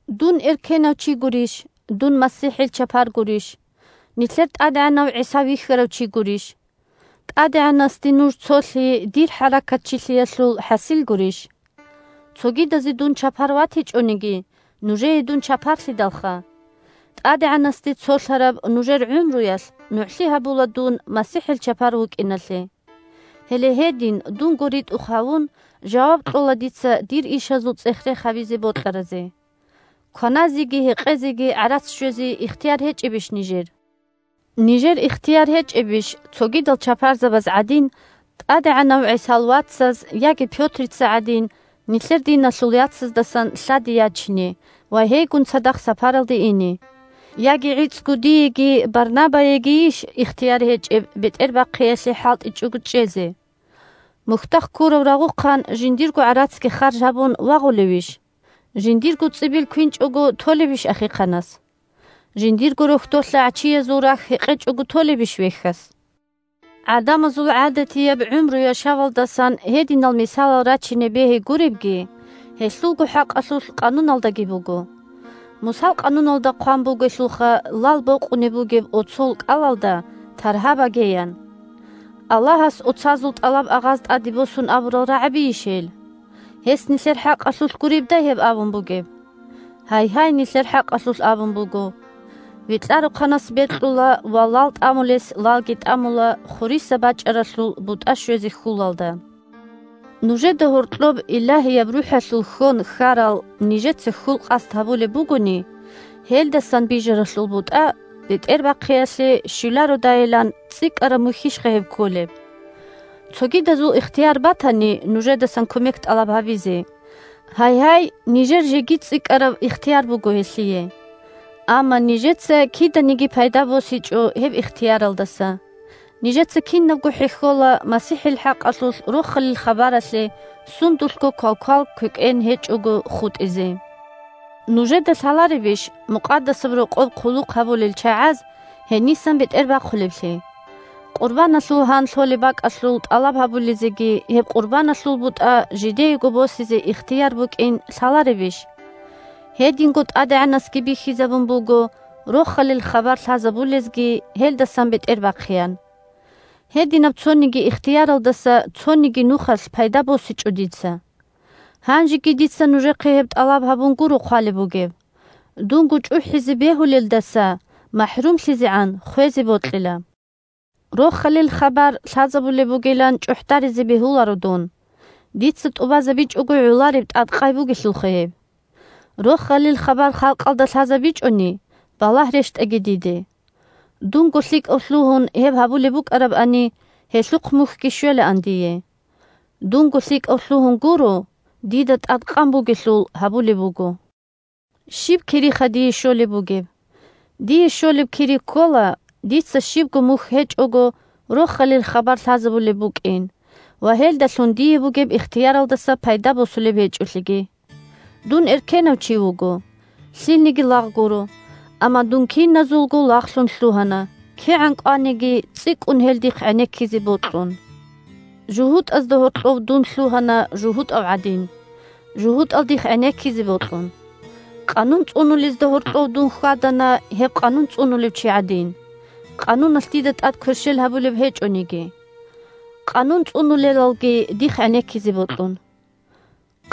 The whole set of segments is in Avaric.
Дун эркенав чи гурищ? Дун МасихӀил чапар гурищ? Нилъер ТӀадегӀанав ГӀиса вихьарав чи гурищ? ТӀадегӀанасде нуж цолъи дир хӀаракатчилъиялъул хӀасил гурищ? Цогидазе дун чапар ватичӀониги, нужее дун чапарлъидалха! ТӀадегӀанасде цолъараб нужер гӀумруялъ нугӀлъи гьабула дун МасихӀил чапар вукӀиналъе. Гьеле гьедин, дунго ритӀухъ гьавун, жаваб кьола дица дир ишазул цӀех-рех гьабизе бокьаразе. Кваназеги гьекъезеги гӀарац щвезе ихтияр гьечӀебищ нижер? Нижер ихтияр гьечӀебищ, цогидал чапарзабаз гӀадин, ТӀадегӀанав ГӀисал вацаз яги Пётрица гӀадин, нилъер диналъул яцаздасан лъади ячине ва гьейгун цадахъ сапаралде ине? Яги гӀицӀго диеги Барнабаегийищ ихтияр гьечӀеб бетӀербахъиялъе хӀалтӀичӀого чӀезе? Мухьдахъ ккурав рагъухъан жиндирго гӀарацги харж гьабун вагъулевищ? Жиндирго цӀибил квинчӀого толебищ ахихъанас? Жиндирго рохьдолъа гӀачиязул рахь гьекъечӀого толебищ вехьас? ГӀадамазул гӀадатияб гӀумру-яшавалдасан гьединал мисалал рачине бегьи гуребги, гьелъулго хӀакъалъулъ Къануналдаги буго. Мусал Къануналда хъван бугелъулха: «Лал бокъунеб бугеб оцол кӀалалда таргьа баге», – ян. Аллагьас оцазул тӀалаб-агъаз тӀаде босун абурал рагӀабийищ гьел? Гьес нилъер хӀакъалъулъ гуребдай гьеб абун бугеб? Гьайгьай, нилъер хӀакъалъулъ абун буго. Векьарухъанас бекьула ва лал тӀамулес лалги тӀамула хуриса бачӀаралъул бутӀа щвезе хьулалда. Нужеда гьоркьоб Илагьияб РухӀалъул хьон хьарал нижеца хьул-къасд гьабулеб бугони, гьелдасан бижаралъул бутӀа бетӀербахъиялъе щвелародайилан – цӀикӀкӀараб мухьищха гьеб кколеб? Цогидазул ихтияр батани нужедасан кумек тӀалаб гьабизе, гьайгьай, нижер жеги цӀикӀкӀараб ихтияр буго гьелъие. Амма нижеца киданиги пайда босичӀо гьеб ихтияралдаса. Нижеца кинабго хӀехьола МасихӀил хӀакъалъулъ Рохалил хабаралъе сундулъго квалквал-квекӀен гьечӀого хутӀизе. Нужеда лъаларебищ Мукъадасаб Рокъоб хъулухъ гьабулел чагӀаз гьенисан бетӀербахъулеблъи? Къурбаналъул гьан лъолеб бакӀалъул тӀалаб гьабулезеги гьеб къурбаналъул бутӀа жидеего босизе ихтияр букӀин лъаларебищ? Гьединго ТӀадегӀанасги бихьизабун буго Рохалил хабар лъазабулезги гьелдасан бетӀербахъеян. Гьединаб цониги ихтияралдаса цониги нухалъ пайда босичӀо дица. Гьанжеги дица нужехъе гьеб тӀалаб гьабун гуро хъвалеб бугеб. Дунго чӀухӀизе бегьулелдаса махӀрумлъизегӀан хвезе бокьила. Рохалил хабар лъазабулеб бугилан чӀухӀдаризе бегьуларо дун. Дица тӀубазабичӀого гӀолареб тӀадкъай бугелъулха гьеб! Рохалил хабар халкъалда лъазабичӀони, балагь рещтӀаги диде! Дунго лъикӀав лъугьун гьеб гьабулеб букӀарабани, гьелъухъ мухьги щвелаан дие. Дунго лъикӀав лъугьун гуро, дида тӀадкъан бугелъул гьабулеб буго. Щиб кириха дие щолеб бугеб? Дие щолеб кири ккола – дица щибго мухь гьечӀого Рохалил хабар лъазабулеб букӀин ва гьелдалъун дие бугеб ихтияралдаса пайда босулеб гьечӀолъиги. Дун эркенав чи вуго, лъилниги лагъ гуро, амма дун киназулго лагълъун лъугьана, кигӀан кӀваниги цӀикӀкӀун гьел дихъ гӀенеккизе бокьун. ЖугьутӀазда гьоркьов дун лъугьана жугьутӀав гӀадин, жугьутӀал дихъ гӀенеккизе бокьун. Къанун цӀунулезда гьоркьов дун хьвадана гьеб Къанун цӀунулев чи гӀадин (Къануналъ дида тӀад кверщел гьабулеб гьечӀониги), Къанун цӀунулелалги дихъ гӀенеккизе бокьун.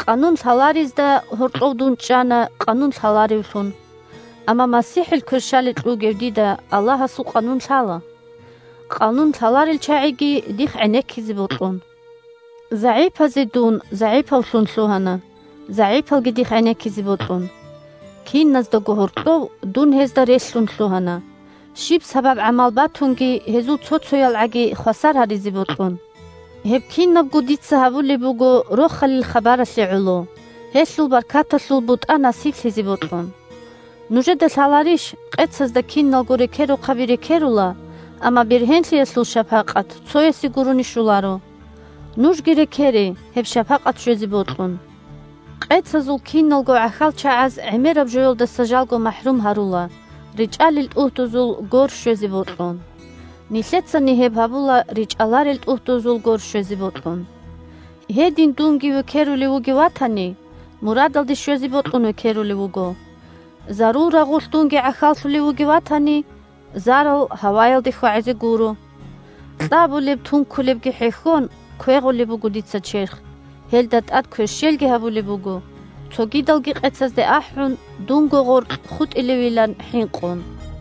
Къанун лъаларезда гьоркьов дун чӀана Къанун лъаларевлъун, (амма МасихӀил кверщаликь вугев дида Аллагьасул къанун лъала), Къанун лъаларел чагӀиги дихъ гӀенеккизе бокьун. ЗагӀипазе дун загӀипавлъун лъугьана, загӀипалги дихъ гӀенеккизе бокьун. Киназдаго гьоркьов дун гьезда релълъун лъугьана, щиб сабаб-гӀамал батунги гьезул цо-цоялгӀаги хвасар гьаризе бокьун. Гьеб кинабго дица гьабулеб буго Рохалил хабаралъе гӀоло, гьелъул баркаталъул бутӀа насиблъизе бокьун. Нужеда лъаларищ: къецазда киналго рекерухъаби рекерула, амма бергьенлъиялъул шапакъат цоясе гурони щоларо. Нужги рекере гьеб шапакъат щвезе бокьун. Къецазул киналго гӀахьалчагӀаз гӀемераб жоялдаса жалго махӀрум гьарула, речӀалел тӀугьдузул гор щвезе бокьун. Нилъецани гьеб гьабула речӀаларел тӀугьдузул гор щвезе бокьун. Гьедин дунги векерулев вугев ватани, мурадалде щвезе бокьун векерулев вуго. Зарул рагъулъ дунги гӀахьаллъулев вугев ватани, зарал гьаваялде хьвагӀизе гуро. Кьабулеб-тункулебги хӀехьон, квегъулеб буго дица черх, гьелда тӀад кверщелги гьабулеб буго, цогидалги къецазде ахӀун, дунго гъоркь хутӀилевилан хӀинкъун.